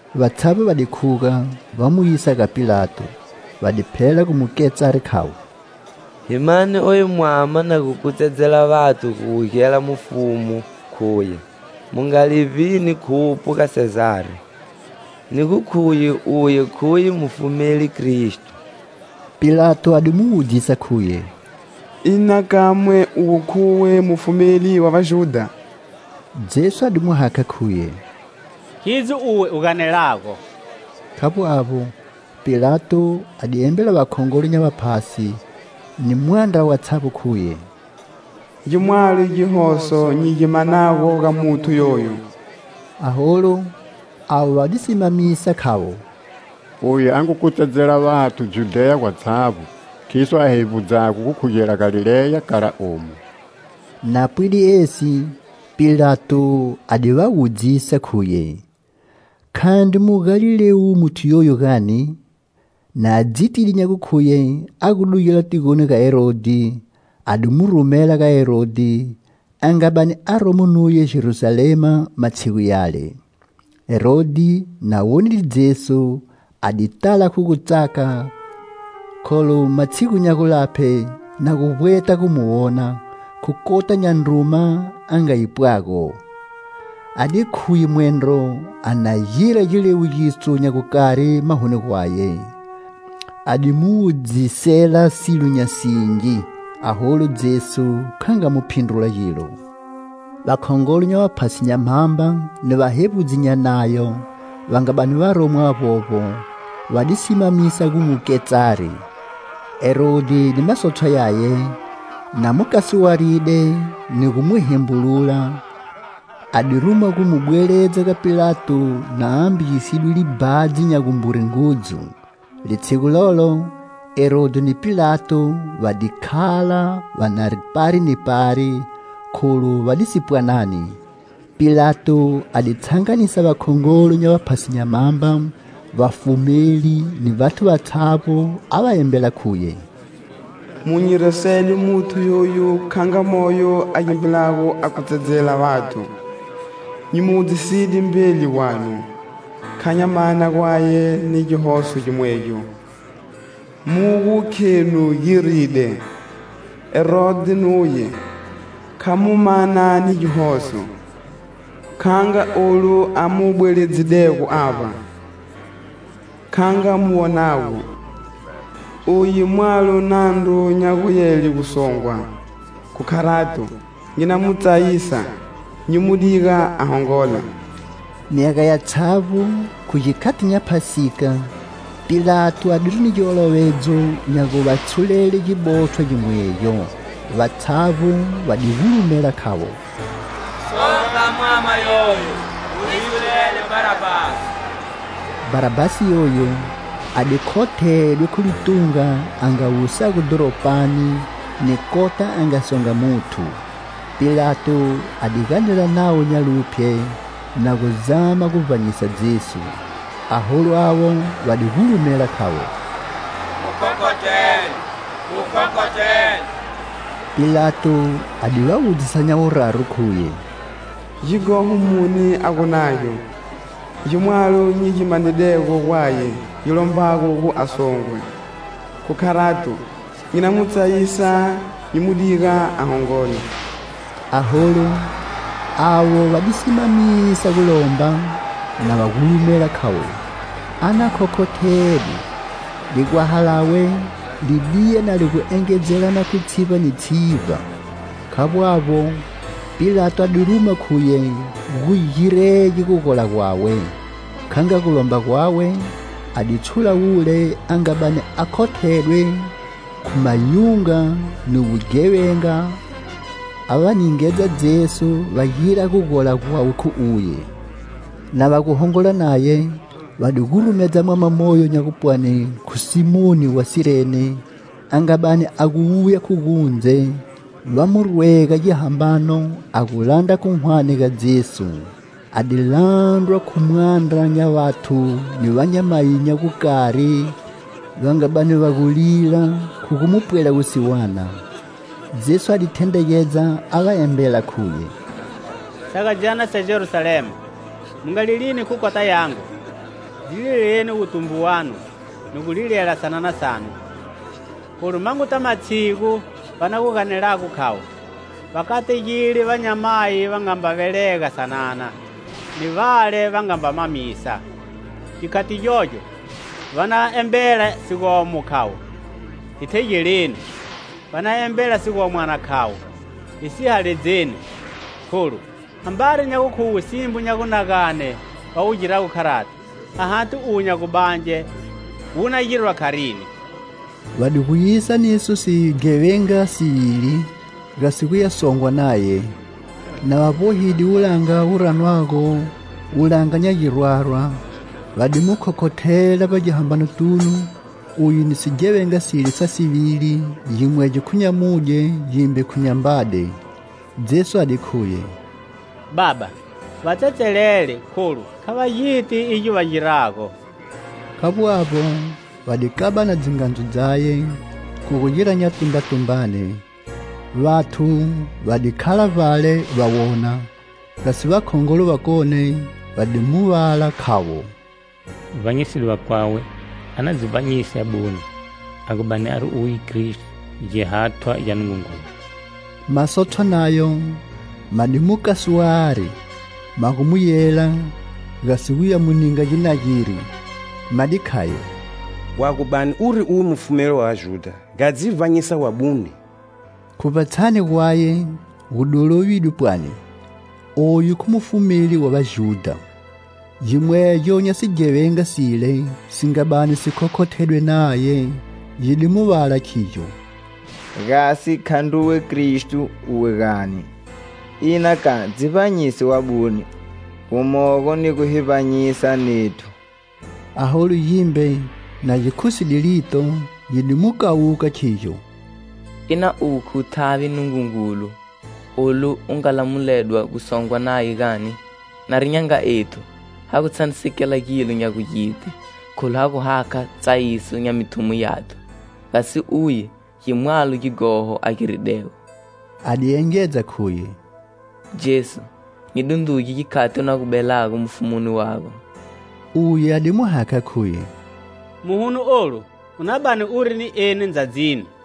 Vatshavbo va di khuga, va mu yisa ga Pilato. Va di phela gu mu ketsari, khavo: "Hi mane oyu mwama na gu kutsedzela vathu gu wugela mufumu, khuye: mu nga livbini khupho ga Sezari, ni gu khuye uye khuye mufumeli Kristo." Pilato a di mu wudzisa, khuye: "Ina kamwe uwe khuwe Mufumeli wa Vajudha?" Jesu a di mu hakha, khuye: "Khidzo uwe u ganelago." Khavbo avbo, Pilato a di embela vakhongolo nya vaphasi ni mwandra watshavbo, khuye: "Gimwalo gihoso nyi gi manago ga muthu yoyu." Aholu avo va di simamisa, khavo: "Uye a ngu kutsedzela vathu Judheya gwatshavbo khiso a hevbudzago gukhugela Galileya kala omu." Na pwide esi, Pilato a di va wudzisa, khuye:"Khandri Mugalilewu muthu yoyu gani?" Na dzitide nya gukhuye a gu dugela tigoni ga Herodhi, a di mu rumela ga Herodhi, a nga bani aromo nuye Jerusalema matshigu yale. Herodhi, na wonide Jesu, a di tala khu gutsaka, kholu matshigu nya gulaphe na gu vbweta gu mu wona, khu kota nya ndruma a nga yipwago. A di khuye mwendro a na gira giliwugiso nya gukari mahoni gwaye. A di mu wudzisela silo nya singi, aholu Jesu kha nga mu phindrula gilo. Vakhongolo nya vaphasi nya mhamba ni vahevbudzi nya Nayo va nga bani varomo avbovbo, va di simamisa gu mu ketsari. Herodhi ni masotshwa yaye, na mu kasuwaride ni gu mu hembulula, a di ruma gu mu bweledza ga Pilato na ambagisidwe libhadzi nya gumbure ngudzu. Litshigu lolo, Herodhi ni Pilato va di khala va na pari ni pari, kholu va disi pwanani. Pilato a di tshanganisa vakhongolo nya vaphasi nya mhamba, vafumeli ni vathu vatshavbo, a va embela, khuye: "Mu nyi resede muthu yoyu kha nga moyo a gimbilago a kutsedzela vathu. Nyi mu wudziside mbeli gwanu, kha nya mana gwaye ni gihoso gimwegyo mugu khenu giride. Herodhi nuye, kha mu mana ni gihoso, kha nga olu a mu bweledzidego avba. Kha nga mu wonago, uye mwalo nandru nya gu yele gu songwa. Khu kharato, nyi na mu tsayisa, nyi mu diga a hongola." [ Myaga yatshavbo khu gikhati nya Phasika, Pilato adiri ni giolovedzo nya gu va tshulele gibotshwa gimwegyo.] Vatshavbo va di gulumela, khavo: "Songa mwama yoyo, u hi tshulele Bharabhasi!" Bharabhasi yoyu, a di khothedwe khu litunga a nga wusago dhoropani, ni kota a nga songa muthu. Pilato a di ganela navo nya luphye, na gu zama gu vbanyisa Jesu. Aholu avo va di gulumela, khavo: "Mu khokhothele! Mu khokhothele!" Pilato a di va wudzisa nya wuraru, khuye: "Gighoho muni a gu nagyo? Gi mwalo nyi gi manidego gwaye gi lombago gu a songwe. Khu kharato, nyi na mu tsayisa, nyi mu diga a hongola." Aholu avo va di simamisa gu lomba, na va gulumela, khavo:"A na khokhothedwe!"Ligwaha lawe li diya na li gu engedzelana khu tshivba ni tshivba. Khavbo avbo, Pilato a di ruma khuye gu girege gugola gwawe. Kha nga gulomba gwawe, a di tshula wule a nga bani a khothedwe khu mayunga ni wughevenga, a va ningedza Jesu va gira gugola gwawe khu uye. Na va gu hongola naye, va di gurumedza mwama moyo nya gupwani khu Simoni wa Sirene, a nga bani a gu wuya khu gundze, va mu rwega gihambano, a gu landra khu hwane ga Jesu. A di landrwa khu mwandra nya vathu ni vanyamayi nya gukari va nga bani va gu lila khu gu mu pwela wusiwana. Jesu a di thendregedza, a va embela, khuye: "Sagadzyana sa Jerusalema, mu nga lilini khu kota yangu; dzi lileleni wutumbu wanu ni gu lilela sanana sanu; kholu manguta matshigu va na gu ganelago, khavo: Va kategide vanyamayi va nga mba velega sanana, ni vale va nga mba mamisa. Gikhati gyogyo va na embela sigomo, khavo: 'Hi thegeleni.' Va na embela sigomwana khavo: 'Hi sihaledzeni!' Kholu, ambari nya gukhuwe simbo nya gunagane va wu girago kharati, a hati uwo nya gubange wu na girwa kharini?" Va di gu yisa niso sighevenga sivili, gasi guya songwa naye. Na va vbohide wulanga wu ranwago wulanga nya girwarwa, va di mu khokhothela vbagihambanotunu uye ni sighevenga sile sa sivili, gimwegyo khu nyamudye, gimbe khu nyambade. Jesu a di khuye: "Baba, va tsetselele, kholu kha va giti igyo va girago." Khavbo avbo, va di kabana dzingadzu dzaye, khu gu gira nyatumbatumbane. Vathu va di khala vbale va wona; gasi vakhongolo vakone va di mu vala, khavo: "Vbanyiside vakwawe; a na dzi vbanyise abune, a gu bani ari uye Kristo, Gihathwa gya Nungungulu!" Masotshwa nayo ma di mu kasuwari, magu mu yela, gasi guya mu ninga ginageri. Ma di khayo: "Wa gu bani uri uwe Mufumeli wa Vajudha, nga dzi vbanyisa wabune!" Khu vbatshani gwaye gu di lovidwe, pwani: "Oyu khu Mufumeli wa Vajudha." Gimwegyo nya sighevenga sile si nga bani si khokhothedwe naye gi di mu vala, khigyo: "Gasi khandruwe Kristo, uwe gani? Ina ka, dzi vbanyise wabune, gumogo ni gu hi vbanyisa nethu." Aholu gimbe, na gi khuside lito, gi di mu kawuka khigyo: "Ina uwe khu thavi Nungungulu. Olu u nga lamuledwa gusongwa naye gani? Nari nya nga ethu, ha gu tshanisekela gilo nya gugiti kholu ha gu hakha tsayiso nya mithumo yathu. Gasi uye gi mwalo gighoho a giridego." A di engedza, khuye: "Jesu, nyi dundruge gikhati u na gu belago mufumuni wago." Uye a di mu hakha, khuye: "Muhuno olu u na bani uri ni eni ndzadzini."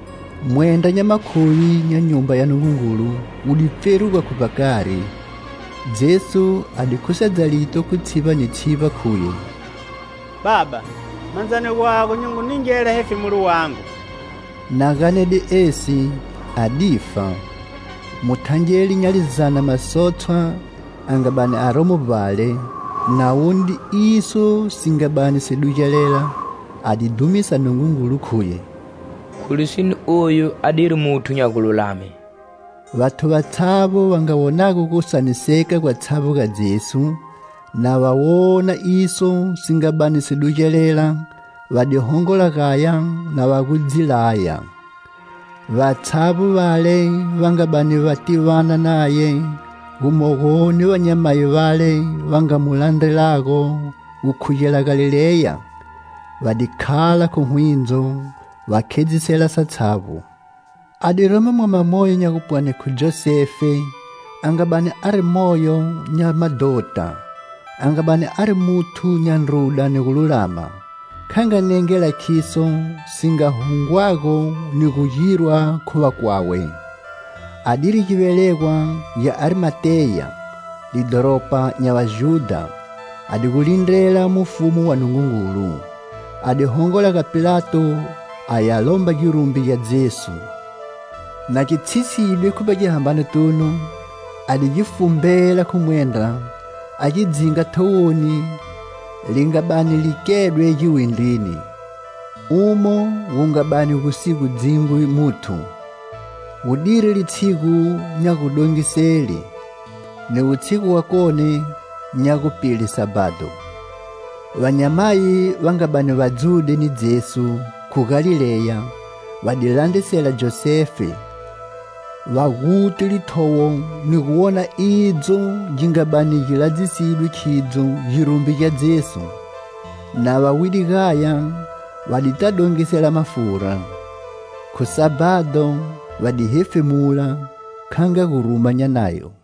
Mwendra nya makhuvi nya Nyumba ya Nungungulu wu di pferuga khu vbakari. Jesu a di khusedza lito khu tshivba ni tshivba, khuye: "Baba, mandzani gwago nyi ngu ningela hefemulo wangu." Na ganede esi, a di fa. Muthangeli nya lizana masotshwa a nga bani aromo vbale, na wonide iso si nga bani si dugelela, a di dhumisa Nungungulu, khuye: "Khu lisine oyu adiri muthu nya gululame!" Vathu vatshavbo va nga wonago gusaniseka gwatshavbo ga Jesu, na va wona iso si nga bani si dugelela, va di hongola gaya na va gu dzi laya. Vatshavbo vale va nga bani va tivana naye, gumogo ni vanyamayi vale va nga mu landrelago gukhugela Galileya, va di khala khu hwindzo, va khedzisela satshavbo. A di romo mwama moyo nya gupwani khu Josefe, a nga bani ari moyo nya madhota, a nga bani ari muthu nya ndruda ni gululama. Kha nga nengela khiso si nga hungwago ni gu girwa khu vakwawe. Adiri givelegwa gya Arimateya, lidhoropa nya Vajudha, a di gu lindrela mufumu wa Nungungulu. A di hongola ga Pilato a ya lomba girumbi gya Jesu; na gi tshiside khu vbagihambanotunu, a di gi fumbela khu mwendra, a gi dzinga thowoni li nga bani li kedwe giwindrini, umo gu nga bani gu si gu dzingwi muthu. Gu diri litshigu nya gudongisele, ni wutshigu wakoni nya gupile Sabhado. Vanyamayi va nga bani va dzude ni Jesu khu Galileya va di landrisela Josefe, va guti lithowo ni gu wona idzo gi nga bani gi ladzisidwe khidzo girumbi gya Jesu. Na va wide gaya, va dita dongisela mafura. Khu Sabhado va di hefemula, kha nga guruma nya Nayo.